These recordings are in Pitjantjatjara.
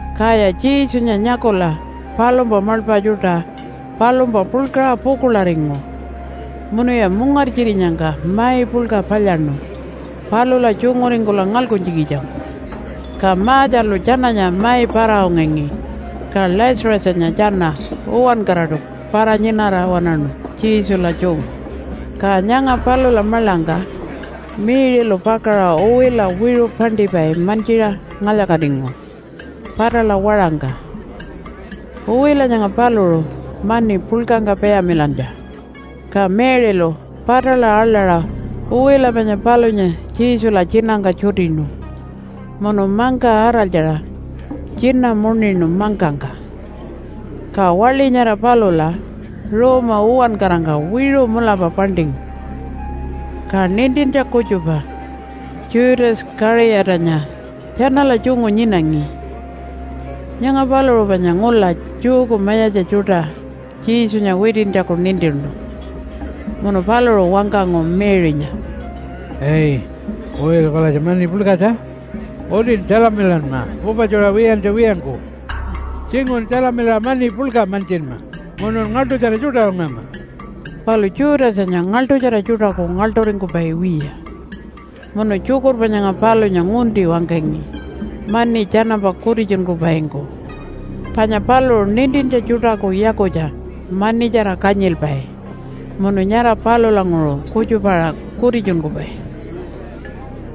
Kaya Jesunya nyakula palumpa maḻpa tjuṯa palumpa puḻkaṟa pukuḻaringu munuya mungartjirinyangka mai puḻka palyaṉu palula tjunguringkula ngalkuntjikitjangku. Ka Marthalu tjananya mai para-ungangi, ka Lazarusanya tjana uwankaraṯu para-nyinara waṉaṉu Jesula tjungu. Ka nyanga palula maḻangka Mary-lu pakaṟa uwila wiṟu paṉṯipai mantjiṟa ngalya-katingu patala waṟangka. Uwila nyanga paluṟu mani puḻkangka payamilantja. Ka Mary-lu patala aḻaṟa uwila panya palunya Jesula tjinangka tjutinu munu mangka araltjaṟa tjina muṉinu mangkangka. Ka waḻi nyara palula ruuma uwankarangka wiṟu mulapa paṉṯingu. Ka nintintja kutjupa Judas Kaṟiyatanya tjanala tjungu nyinangi. (Nyanga paluṟu panya ngula Jewku mayatja tjuṯa Jesunya witintjaku nintinu.) Munu paluṟu wangkangu Mary-nya, “Ai! Uwila palatja mani puḻkatja. Utin tjalamilanma pupatjuṟa wiyantja wiyangku. Tjinguṟun tjalamilaṟa mani puḻka mantjinma munun ngaḻṯutjara tjuṯa ungama.” Palu Judasanya ngaḻṯutjara tjuṯaku ngaḻṯuringkupai wiya, munu tjukurpa nyanga palunya ngunti wangkangi mani tjanampa kutitjunkupaingku. Panya paluṟu nintintja tjuṯaku yakutja manitjara kanyilpai munu nyara palulanguṟu kutjupa-aṟa kutitjunkupai.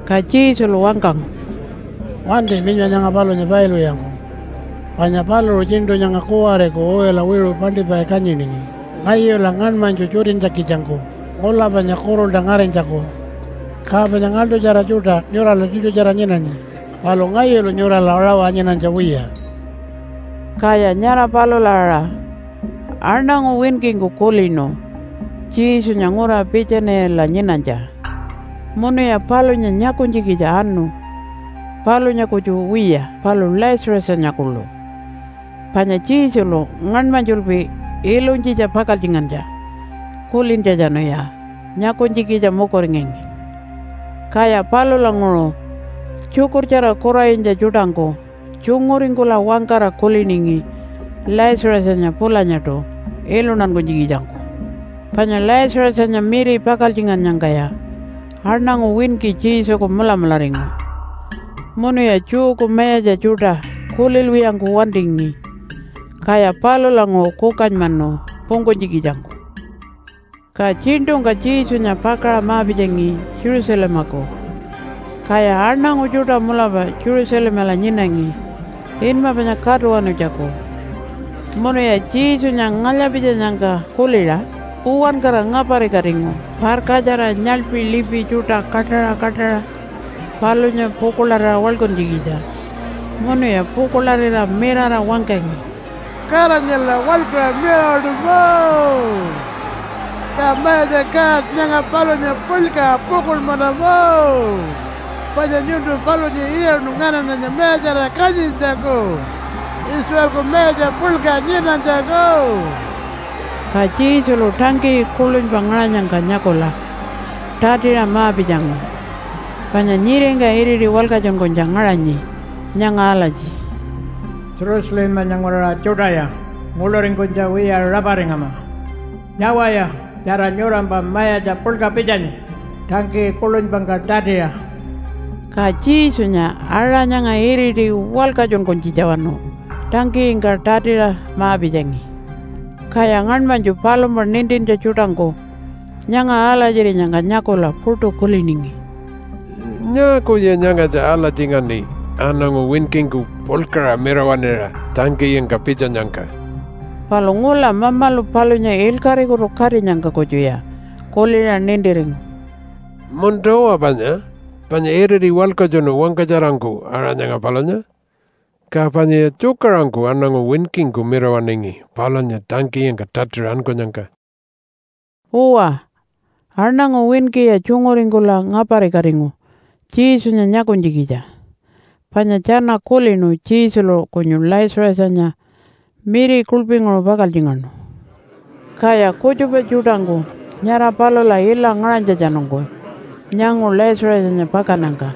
Ka Jesulu wangkangu, “Wanti minyma nyanga palunya pailwiyangku. Panya paluṟu tjiṉṯu nyanga kuwariku uwila wiṟu paṉṯipai kanyiningi ngayula ngaṉmanytju tjutintjikitjangku ngula panya kuṟulta ngarinytjaku. Ka panya ngaḻṯutjara tjuṯa nyurala tiṯutjara nyinanyi, palu ngayulu nyurala rawa nyinanytja wiya.” Kaya nyara palula aṟa aṉangu winkingku kulinu Jesunya ngura Piitjanila nyinanytja. Munuya palunya nyakunytjikitja anu, palunya kutju wiya palu Lazarusanya kuḻu. Panya Jesulu ngaṉmanytjulpi ilunytjitja pakaltjingantja kulintjatjanuya nyakunytjikitja mukuringangi. Kaya palulanguṟu tjukurtjara kuranyitja tjuṯangku tjunguringkula wangkara kuliningi Lazarusanya pulanyaṯu iluntankunytjikitjangku. Panya Lazarusanya miri pakaltjingannyangkaya aṉangu winki Jesuku mulamularingu munuya Jewku mayatja tjuṯa kulilwiyangku wantingi. Kaya palulanguṟu kukanymanu pungkunytjikitjangku. Ka tjiṉṯungka Jesunya pakaṟa ma-pitjangi Jerusalemaku. Kaya aṉangu tjuṯa mulapa Jerusalemala nyinangi inma panya Katuwanutjaku. Munuya Jesunya ngalya-pitjanyangka kuliṟa uwankara ngaparikatingu parkatjara, nyaḻpi lipi tjuṯa kaṯaṟa kaṯaṟa palunya pukuḻarira waḻkuntjikitja. Munuya pukuḻarira mirara wangkangi, “Godanyala waḻkuṟa mirawaṉima! Ka Mayatja God, nyanga palunya puḻkaṟa pukuḻmanama, panya nyuntu palunya iyaṉu nganaṉanya mayatjarira kanyintjaku, Israelku mayatja puḻka nyinanytjaku.” Ka Jesulu tangkiyi kuḻunypa ngaṟanyangka nyakula tatiṟa ma-pitjangu, panya nyiringka iriti walkatjunkunytja ngaṟanyi nyanga alatji, “Jerusalemanya nguraṟa tjuṯaya nguḻuringkunytja wiya raparingama! Nyawaya nyara nyurampa Mayatja Puḻka pitjanyi tangkiyi kuḻunypangka tatiṟa.” Ka Jesunya aṟa nyanga iriti walkatjunkunytjitjawanu tangkiyingka tatiṟa ma-pitjangi. Kaya ngaṉmanytju palumpa nintintja tjuṯangku nyanga alatjirinyangka nyakula puṯu kuliningi, “Nyaakuya nyangatja alatjingaṉi aṉangu winkingku puḻkaṟa mirawaṉira tangkiyingka pitjanyangka?” Palu ngula Mamalu palunya ilkaṟikutu katinyangka kutjuya kuliṟa nintiringu, “Munta-uwa panya, panya iriti walkatjunu wangkatjarangku aṟa nyanga palunya, ka panyaya tjukaṟurungku aṉangu winkingku mirawaṉingi palunya tangkiyingka tatiṟa ankunyangka.” Uwa, aṉangu winkiya tjunguringkula ngaparikatingu Jesunya nyakunytjikitja. Panya tjana kulinu Jesulu kunyu Lazarusanya miri kuḻpinguṟu pakaltjingaṉu. Kaya kutjupa tjuṯangku nyara palula ila ngaṟanytjatjanungku nyangu Lazarusanya pakannyangka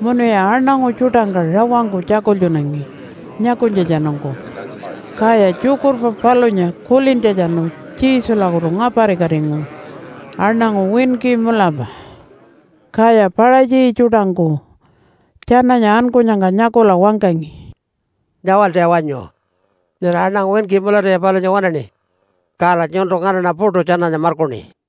munuya aṉangu tjuṯangka rawangku tjakultjunangi nyakunytjatjanungku. Kaya tjukurpa palunya kulintjatjanu Jesulakutu ngaparikatingu aṉangu winki mulapa. Kaya Paṟatji tjuṯangku tjananya ankunyangka nyakula wangkangi, “Nyawaltaya wanyu! Nyara aṉangu winki mulatuya palunya waṉaṉi. Kala nyuntu nganaṉa puṯu tjananya markuṉi.”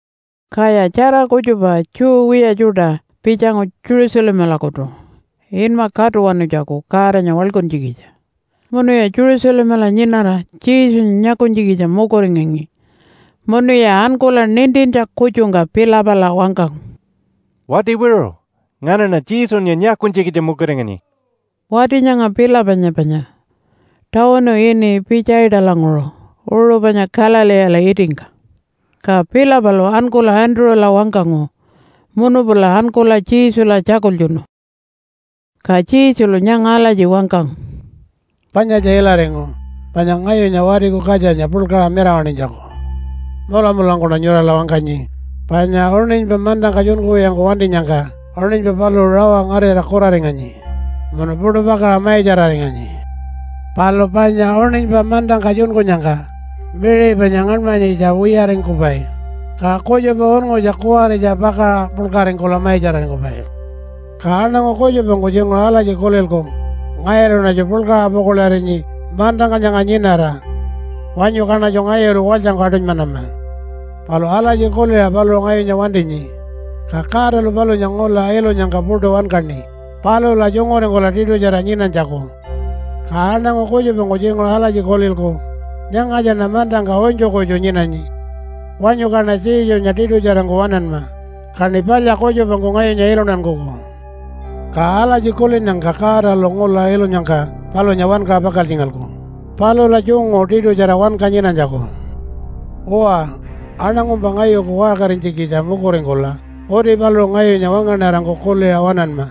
Kaya tjara kutjupa Jew wiya tjuṯa pitjangu Jerusalemalakutu inma Katuwanutjaku Godanya waḻkuntjikitja. Munuya Jerusalemala nyinara Jesunya nyakunytjikitja mukuringangi. Munuya ankula nintintja kutjungka Philipala wangkangu, “Wati wiṟu, nganaṉa Jesunya nyakunytjikitja mukuringanyi.” (Wati nyanga Philipanya panya tawunu ini Pitjaitalanguṟu uṟu panya Galileela itingka.) Ka Philipalu ankula Andrew-la wangkangu, munu pula ankula Jesula tjakultjunu. Ka Jesulu nyanga alatji wangkangu, “Panyatja ilaringu panya ngayunya Watiku Katjanya puḻkaṟa mirawaṉinytjaku. Mulamulangkuṉa nyurala wangkanyi, panya uṉinypa mantangka tjunkuwiyangku wantinyangka uṉinypa paluṟu rawa ngarira kuraringanyi munu puṯu pakaṟa maitjararinganyi. Palu panya uṉinypa mantangka tjunkunyangka miṟi panya ngaṉmanyitja wiyaringkupai, ka kutjupa unngutja kuwaritja pakaṟa puḻkaringkula maitjararingkupai. Ka aṉangu kutjupangku tjinguṟu alatji kulilku, ‘Ngayuluṉatju puḻkaṟa pukuḻarinyi mantangka nyanga nyinara. Wanyu kaṉatju ngayulu walytjangku aṯunymanama.’ Palu alatji kuliṟa paluṟu ngayunya wantinyi, ka Godalu palunya ngula ilunyangka puṯu wankaṉi palula tjunguringkula tiṯutjara nyinanytjaku. Ka aṉangu kutjupangku tjinguṟu alatji kulilku, ‘Nyangatjaṉa mantangka unytju kutju nyinanyi. Wanyu kaṉa Jesunya tiṯutjarangku waṉanma, kaṉi palya kutjupangku ngayunya iluntankuku.’ Ka alatji kulinnyangka Godalu ngula ilunyangka palunya wankaṟa pakaltjingalku palula tjungu tiṯutjara wanka nyinanytjaku. Uwa, aṉangumpa ngayuku waṟkarinytjikitja mukuringkula uti paluṟu ngayunya wangaṉarangku kuliṟa waṉanma.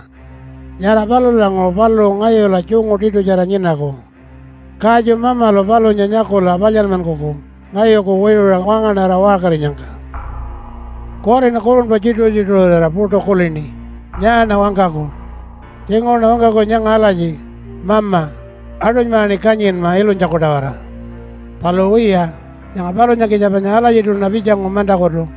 Nyara palulanguṟu paluṟu ngayula tjungu tiṯutjara nyinaku. Katju Mamalu palunya nyakula palyanmankuku ngayuku wiṟuṟa wangaṉara waṟkarinyangka. “Kuwariṉa kurunpa tjituṟu-tjituṟurira puṯu kulini, ‘Nyaaṉa wangkaku?’ Tjinguṟuṉa wangkaku nyanga alatji, ‘Mama, aṯunymaṟaṉi kanyinma ilunytjaku-tawara.’ Palu wiya, nyanga palunyakitja panya alatjiṯuṉa pitjangu mantakutu.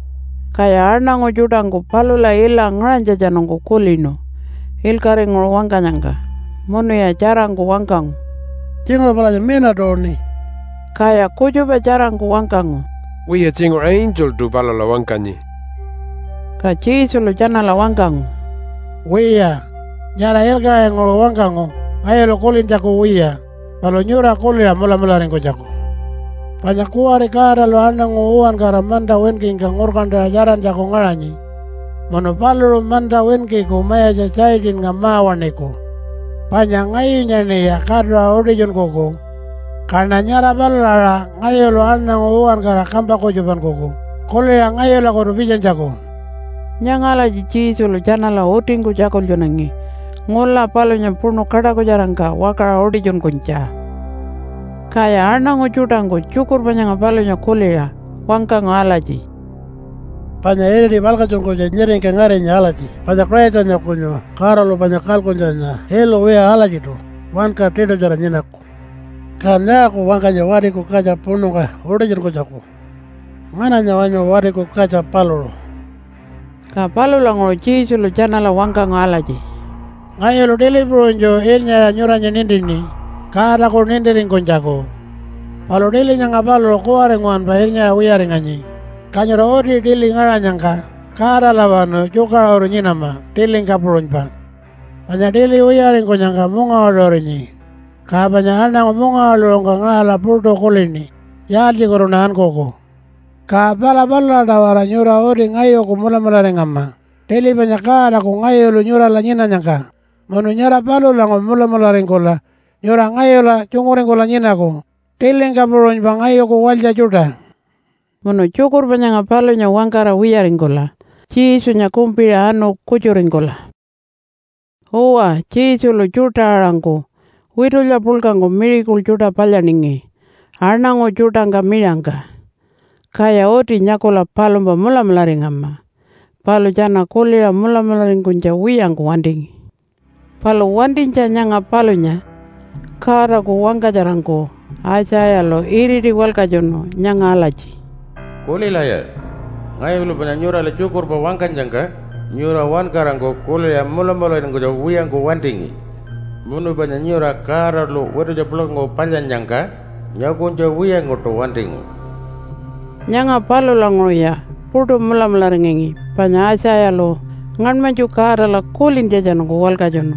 Kaya aṉangu tjuṯangku palula ila ngaṟanytjatjanungku kulinu ilkaṟinguṟu wangkanyangka, munuya tjarangku wangkangu, “Tjinguṟu palatja mina tuuṉi!” Kaya kutjupa tjarangku wangkangu, “Wiya, tjinguṟu angeltu palula wangkanyi.” Ka Jesulu tjanala wangkangu, “Wiya, nyara ilkaṟinguṟu wangkangu ngayulu kulintjaku wiya, palu nyura kuliṟa mulamularingkunytjaku. Panya kuwari Godalu aṉangu uwankara manta winkingka ngurkantaṟa tjarantjaku ngaṟanyi. Munu paluṟu manta winkiku mayatja Satannga ma-waṉiku. Panya ngayunyaṉiya katuṟa utitjunkuku, kaṉa nyara palula aṟa ngayulu aṉangu uwankara kampa kutjupankuku kuliṟa ngayulakutu pitjanytjaku.” Nyanga alatji Jesulu tjanala utingku tjakultjunangi ngula palunya puṉu kaṯakutjarangka wakaṟa utitjunkunytja. Kaya aṉangu tjuṯangku tjukurpa nyanga palunya kuliṟa wangkangu alatji, “Panya iriti walkatjunkunytja nyiringka ngarinyi alatji panya Christanya kunyu Godalu panya kalkuntjanya ilu wiya alatjiṯu wanka tiṯutjara nyinaku. Kan nyaaku wangkanyi Watiku Katja puṉungka utitjunkunytjaku? Ngananya wanyu Watiku Katja paluṟu?” Ka palulanguṟu Jesulu tjanala wangkangu alatji, “Ngayulu tili puṟunytju irnyaṟa nyuranya nintini Godaku nintiringkunytjaku. Palu tili nyanga paluṟu kuwari nguwanpa irnyaṟa wiyaringanyi, ka nyura uti tili ngaṟanyangka Godalawanu tjukaṟuru nyinama tilingka puṟunypa. Panya tili wiyaringkunyangka mungawaḻuṟurinyi, ka panya aṉangu mungawaḻuṟungka ngaṟala puṯu kulini, ‘Yaaltjikutuṉa ankuku?’ Ka pala palula-tawara nyura uti ngayuku mulamularingama tili panya Godaku ngayulu nyurala nyinanyangka, munu nyara palulanguṟu mulamularingkula nyura ngayula tjunguringkula nyinaku tilingka puṟunypa ngayuku walytja tjuṯa.” Munu tjukurpa nyanga palunya wangkara wiyaringkula Jesunya kumpiṟa anu kutjuringkula. Uwa, Jesulu tjuṯa-aṟangku witulya puḻkangku miracle tjuṯa palyaningi aṉangu tjuṯangka miṟangka. Kaya uti nyakula palumpa mulamularingama, palu tjana kuliṟa mulamularingkunytja wiyangku wantingi. Palu wantinytja nyanga palunya Godaku wangkatjarangku Aitjayalu iriti walkatjunu nyanga alatji, “Kulilaya! Ngayulu panya nyurala tjukurpa wangkanyangka nyura uwankarangku kuliṟa mulamularingkunytja wiyangku wantingi. Munu panya nyura Godalu witulya puḻkangku palyannyangka nyakunytja wiyangkuṯu wantingu.” Nyanga palulanguṟuya puṯu mulamularingangi panya Aitjayalu ngaṉmanytju Godala kulintjatjanungku walkatjunu.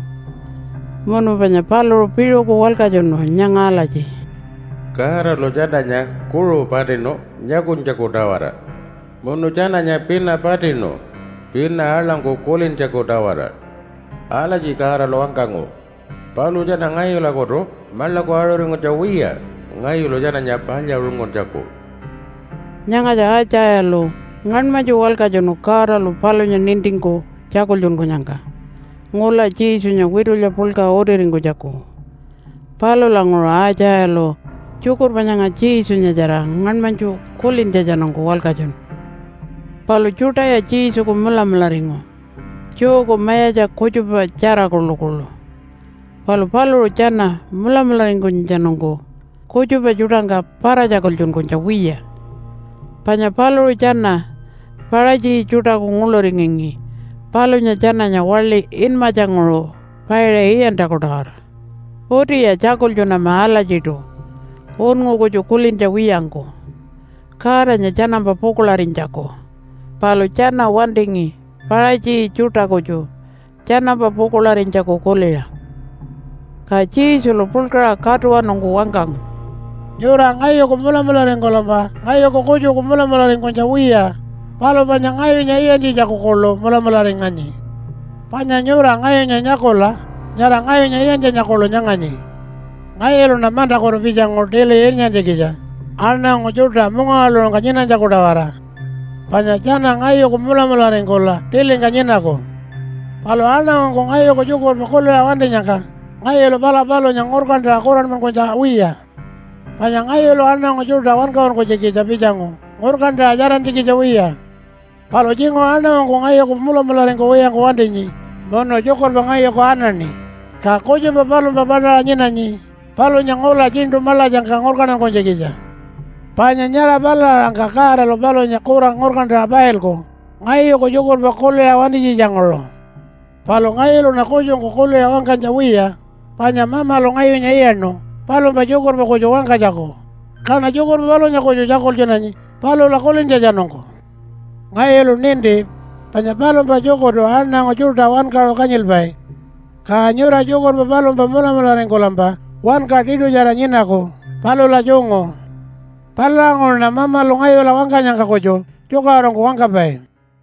Munu panya paluṟu piṟuku walkatjunu nyanga alatji, “Godalu tjananya kuṟu patinu nyakunytjaku-tawara. Munu tjananya pina patinu pina aḻangku kulintjaku-tawara. Alatji Godalu wangkangu, ‘Paluṟu tjana ngayulakutu maḻaku aṟuringkunytja wiya ngayulu tjananya palyaṟunguntjaku.’” Nyangatja Aitjayalu ngaṉmanytju walkatjunu Godalu palunya nintingku tjakultjunkunyangka ngula Jesunya witulya puḻka utiringkunytjaku. Palulanguṟu Aitjayalu tjukurpa nyanga Jesunyatjara ngaṉmanytju kulintjatjanungku walkatjunu. Palu tjuṯaya Jesuku mulamularingu, Jewku mayatja kutjupatjara kuḻukuḻu. Palu paluṟu tjana mulamularingkunytjatjanungku kutjupa tjuṯangka para-tjakultjunkunytja wiya, panya paluṟu tjana Paṟatji tjuṯaku nguḻuringangi palunya tjananya waḻi inmatjanguṟu paiṟa iyantjaku-tawara. Utiya tjakultjunama alatjiṯu unngu kutju kulintja wiyangku, Godanya tjanampa pukuḻarinytjaku. Palu tjana wantingi Paṟatji tjuṯa kutju tjanampa pukuḻarinytjaku kuliṟa. Ka Jesulu puḻkaṟa katuwanungku wangkangu, “Nyura ngayuku mulamularingkulampa ngayuku kutjuku mulamularingkunytja wiya, palu panya ngayunya iyantjitjaku kuḻu mulamularinganyi. Panya nyura ngayunya nyakula nyara ngayunya iyantjanya kuḻu nyanganyi. Ngayuluṉa mantakutu pitjangu tili irnyantjikitja, aṉangu tjuṯa mungawaḻuṟungka nyinanytjaku-tawara. Panya tjana ngayuku mulamularingkula tilingka nyinaku. Palu aṉangungku ngayuku tjukurpa kuliṟa wantinyangka ngayulu pala palunya ngurkantaṟa kuranmankunytja wiya. Panya ngayulu aṉangu tjuṯa wankaṟunkunytjikitja pitjangu ngurkantaṟa tjarantjikitja wiya. Palu tjinguṟu aṉangungku ngayuku mulamularingkuwiyangku wantinyi munu tjukurpa ngayuku anaṉi, ka kutjupa palumpa paṯaṟa nyinanyi palunya ngula tjiṉṯu maḻatjangka ngurkantankunytjikitja. Panya nyara palula aṟangka Godalu palunya kura ngurkantaṟa pailku ngayuku tjukurpa kuliṟa wantinytjitjanguṟu. Palu ngayuluṉa kutjungku kuliṟa wangkanytja wiya, panya Mamalu ngayunya iyaṉu palumpa tjukurpa kutju wangkanytjaku kaṉa tjukurpa palunya kutju tjakultjunanyi palula kulintjatjanungku. Ngayulu ninti panya palumpa tjukurtu aṉangu tjuṯa wankaṟu kanyilpai. Ka nyura tjukurpa palumpa mulamularingkulampa wanka tiṯutjara nyinaku palula tjungu. Palulanguṟuṉa Mamalu ngayula wangkanyangka kutju tjukaṟurungku wangkapai.”